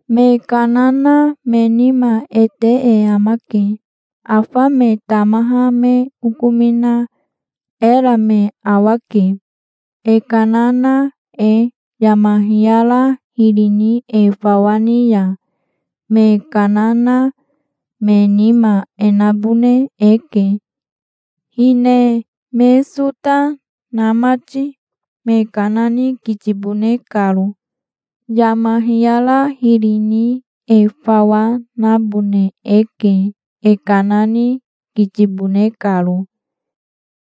Me kana na me nima e te e amake. Afa me tamaha me okomina era me awake, e kana na e. Yama hiyara hiri ni e fawa ni ya me kana na me nima e nabone eke, hine me sota na mati, me kana ni kitibone karo. Yama hiyara hiri ni e fawa nabone eke, e kana ni kitibone karo,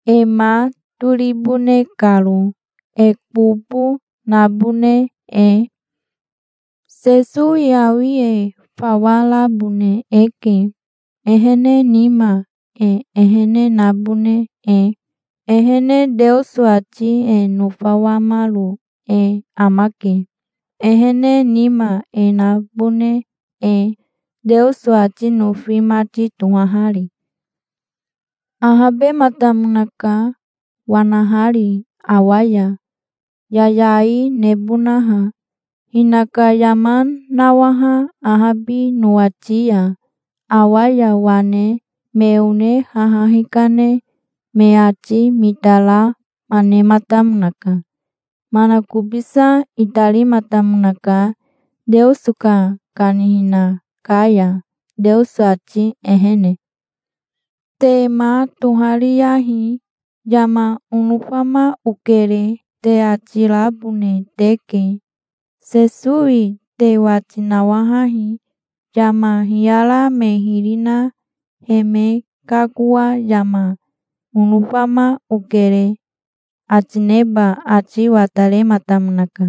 e ma toribone karo, e kobo nabone e. Sesowi awi e fawa rabone eke, ehene nima e ehene nabone e. Ehene Teoso ati e nofawamaro e amake, ehene nima e nabone e, Teoso ati nofi mati tohahari. Ahabematamonaka wanahari awa ya, yayai nebonaha, hinaka yama nawaha ahabi nowati ya. Awa ya wane me one haha hikane me ati mitarama nematamonaka. Manakobisa itarimatamonaka, Teoso ka kanihina ka ya, Teoso ati ehene. Te ma tohariyahi. "Yama onofama okere", te ati rabone teke. Sesowi te wati nawahahi. Yama hiyara me hiri na he me kakoa, "Yama onofama okere", ati neba ati watarematamonaka.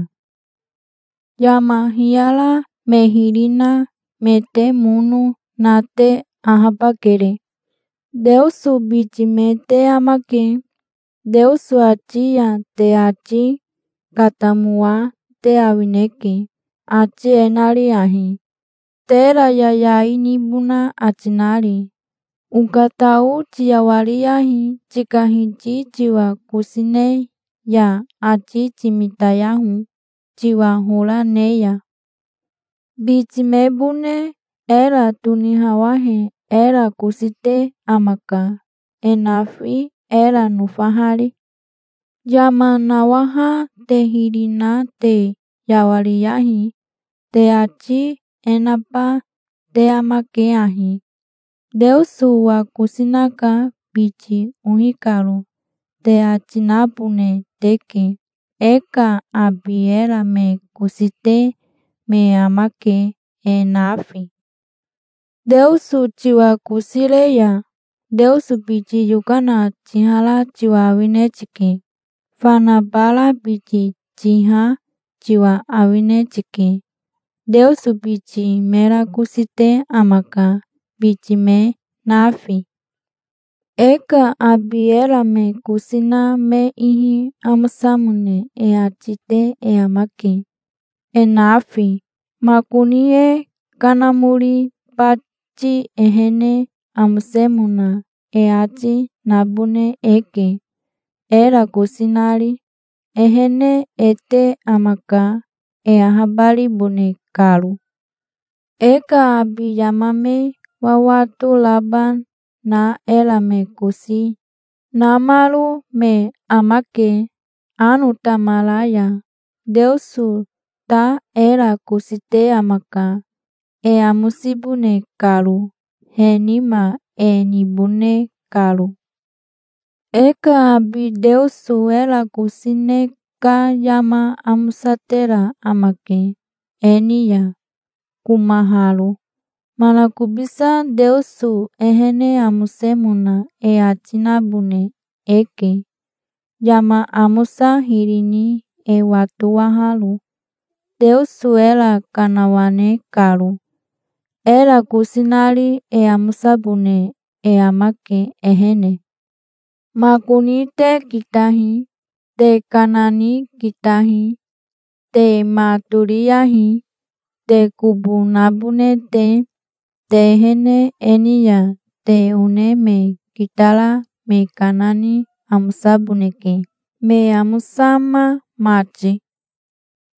Yama hiyara me hiri na me te mono na te ahabakere. Teoso biti me te amake. Teoso ati ya te ati katamoa te awineke, ati e nari ahi, tera yayai nibona ati nari: "Okatao tiyawariyahi, tika Hiti tiwa kosi ne ya. Ati timitayaho, tiwa hora ne ya. Biti mebone era tonihawahe era kosi te amaka, e nafi, era nofahari". Yama nawaha te hiri na te yawariyahi. Te ati e naba te amake ahi: "Teoso owa kosi naka, biti ohi karo", te ati nabone teke. E ka abi era me kosi te me amake, e nafi. Teoso tiwa kosi re ya Teoso biti yokana tihara tiwa awine tike. Fana bara biti tiha tiwa awine tike. Teoso biti mera kosi te amaka, biti me nafi. E ka abi era me kosi na me ihi amosamone e ati te e amake, e nafi. Makoni e kanamori bati ehene amosemona e ati, nabone eke, era kosi nari. Ehene e te amaka, e ahabaribone karo. E ka abi yama me wawato raba na era me kosi namaro me amake, ano tamara ya. Teoso ta era kosi te amaka e amosibone karo, he nima e nibone karo. E ka abi Teoso era kosi ne ka yama amosatera amake e ni ya, komaharo. Manakobisa Teoso ehene amosemona e ati nabone eke, yama amosa hiri ni e watowaharo, Teoso era kanawane karo, era kosi nari. E amosabone e amake ehene. Makoni te kitahi. Te kana ni kitahi. Te ma toriyahi, te kobo nabone te. Te ehene e ni ya te one me kitara me kana ni amosaboneke, me amosama mati.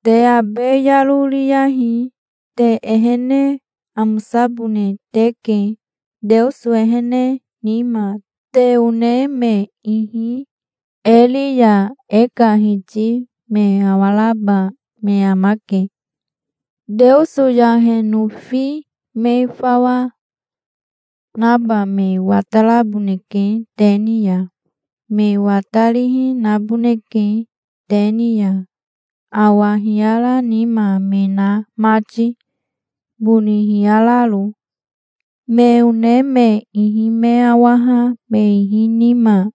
Te abe yaro riyahi. Te ehene amosabone teke, Teoso ehene nima. Te one me ihi e ri ya e ka Hiti me awaraba me amake. Teoso yahe nofi me fawa naba me wataraboneke te ni ya. Me watarihi naboneke te ni ya, awa hiyara nima me na mati, boni hiyararo. Me one me ihi me awaha me ihi nima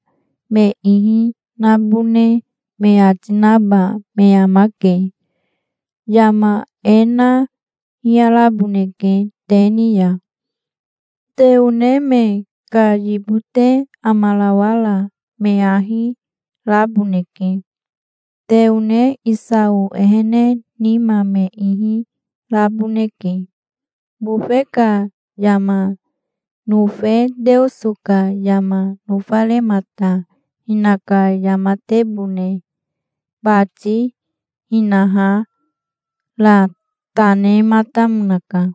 me ihi nabone me ati naba me amake. Yama e na hiyaraboneke te ni ya. Te one me ka yibote amarawara me ahi raboneke. Te one Isao ehene nima me ihi raboneke, bofe ka yama nofe Teoso ka yama nofaremata. Hinaka yamatebone bati hinaha ra ta nematamonaka,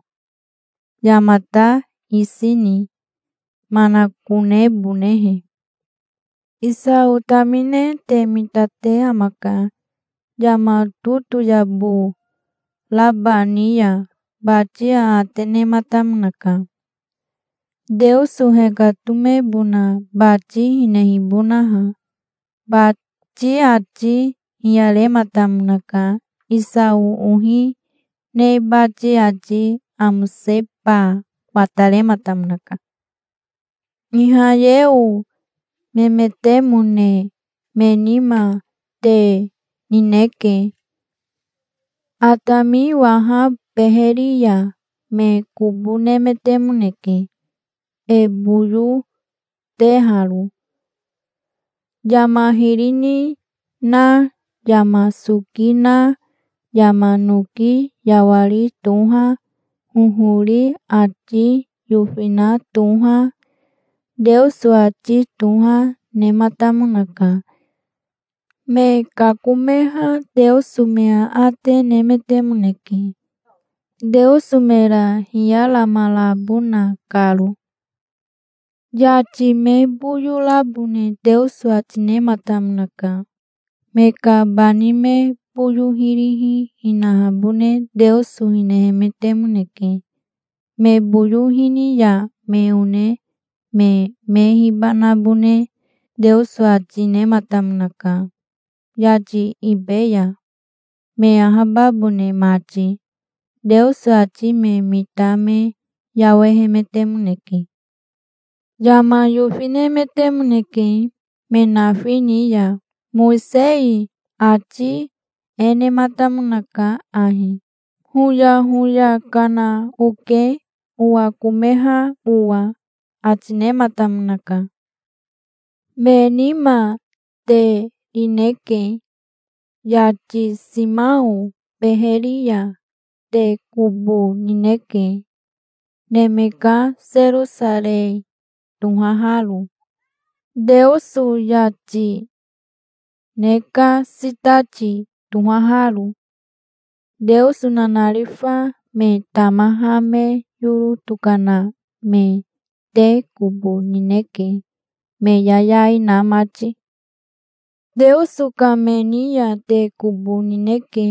yamata isi ni manakonebonehe. Isao tamine te mitate amaka. Yama totoyabo raba ni ya bati aate nematamonaka, Teoso hekatomebona bati hinehibonaha. Bati ati hiyarematamonaka. Isao ohi ne bati ati amoseba watarematamonaka. Ihayeo memetemone me nima te rineke. Atami waha beheri ya me kobo nemetemoneke, e boyo teharo. Yama hiri ni na, yama soki na, yama noki yawari toha, hohori ati yofina toha, Teoso ati toha, nematamonaka. Me kakomeha Teoso me aate nemetemoneke, Teoso mera hiyaramarabona karo. Yati me boyo rabone Teoso ati nematamonaka. Me ka bani me boyo hirihi hinahabone Teoso hinehemetemoneke. Me boyo hini ya me one me me hibanabone Teoso ati nematamonaka, yati ibe ya, me ahababone mati. Teoso ati me mita me yawehemetemoneke. Yama yofinemetemoneke me nafi ni ya. Mowisei ati e nematamonaka ahi: "Hoyahoya kana oke, owakomeha owa", ati nematamonaka. Me nima te rineke. Yati Siao beheri ya te kobo nineke, neme ka Serosarei tohaharo, Teoso yati ne ka sitati tohaharo. Teoso nanarifa me tamaha me yoro tokana me te kobo nineke, me yayai na mati. Teoso ka me ni ya te kobo nineke,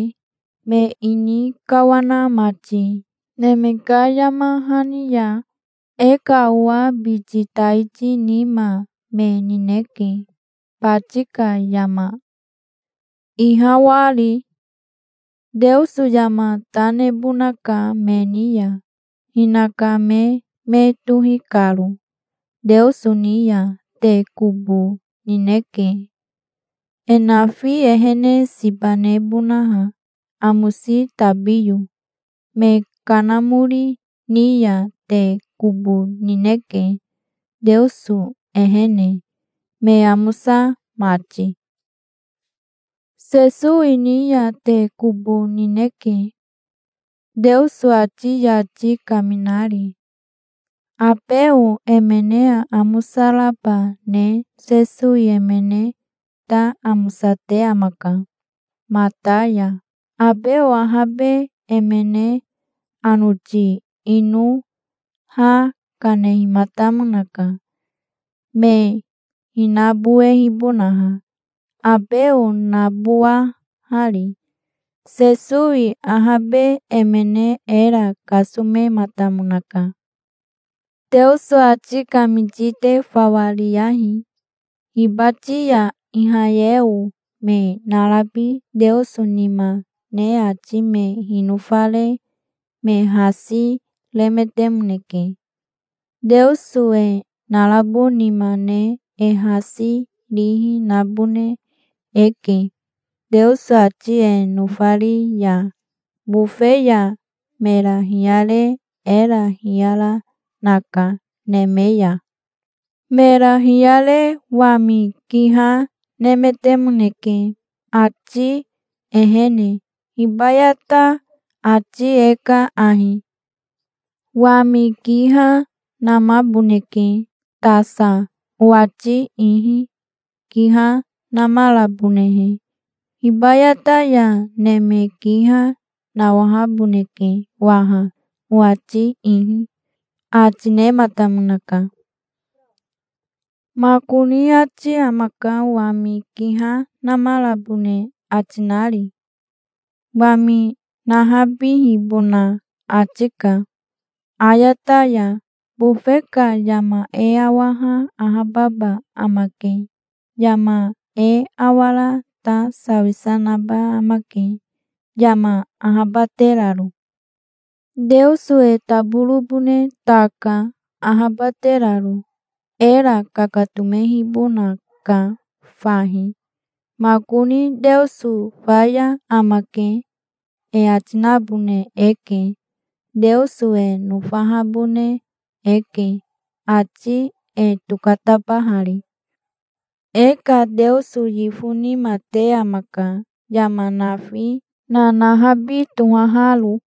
me ini kawana mati neme ka yama hani ya. E ka owa biti taiti nima me nineke, bati ka yama ihawahari. Teoso yama ta nebonaka me ni ya, hinaka me me tohi karo. Teoso ni ya te kobo nineke, e nafi ehene siba nebonaha, amosi tabiyo. Me kanamori ni ya te kobo nineke, Teoso ehene me amosa mati. Sesowi ni ya te kobo nineke, Teoso ati yati kaminari. Abeo emene aamosa raba ne Sesowi emene ta amosate amaka mata ya. Abeo ahabe emene anoti ino ha kanehimatamonaka, me hinabowebonaha, Abeo nabowahari. Sesowi ahabe emene era kasomematamonaka. Teoso ati kamiti te fawa riyahi. Hibati ya Ihayeo me narabi Teoso nima ne ati me hinofare me hasi remetemoneke. Teoso e narabo nima ne e hasi rihi nabone eke, Teoso ati e nofari ya. Bofe ya mera hiyare era hiyara naka neme ya. Mera hiyare wami kiha nemetemoneke, ati ehene. Hibayata ati e ka ahi: "Wami kiha namaboneke tasa owati ihi, kiha namarabonehe. Hibayata ya neme kiha nawahaboneke waha owati ihi", ati nematamonaka. Makoni ati amaka, wami kiha namarabone ati nari. Wami nahabihibona ati ka ayata ya. Bofe ka yama e awaha ahababa amake. Yama e awara ta sawisa naba amake, yama ahabateraro. Teoso e taborobone ta ka, ahabateraro. Era kakatomehibonaka fahi. Makoni, "Teoso faya amake", e ati nabone eke. Teoso e nofahabone eke, ati e tokatabahari. E ka Teoso yifo nima te amaka, yama nafi nanahabi tohaharo.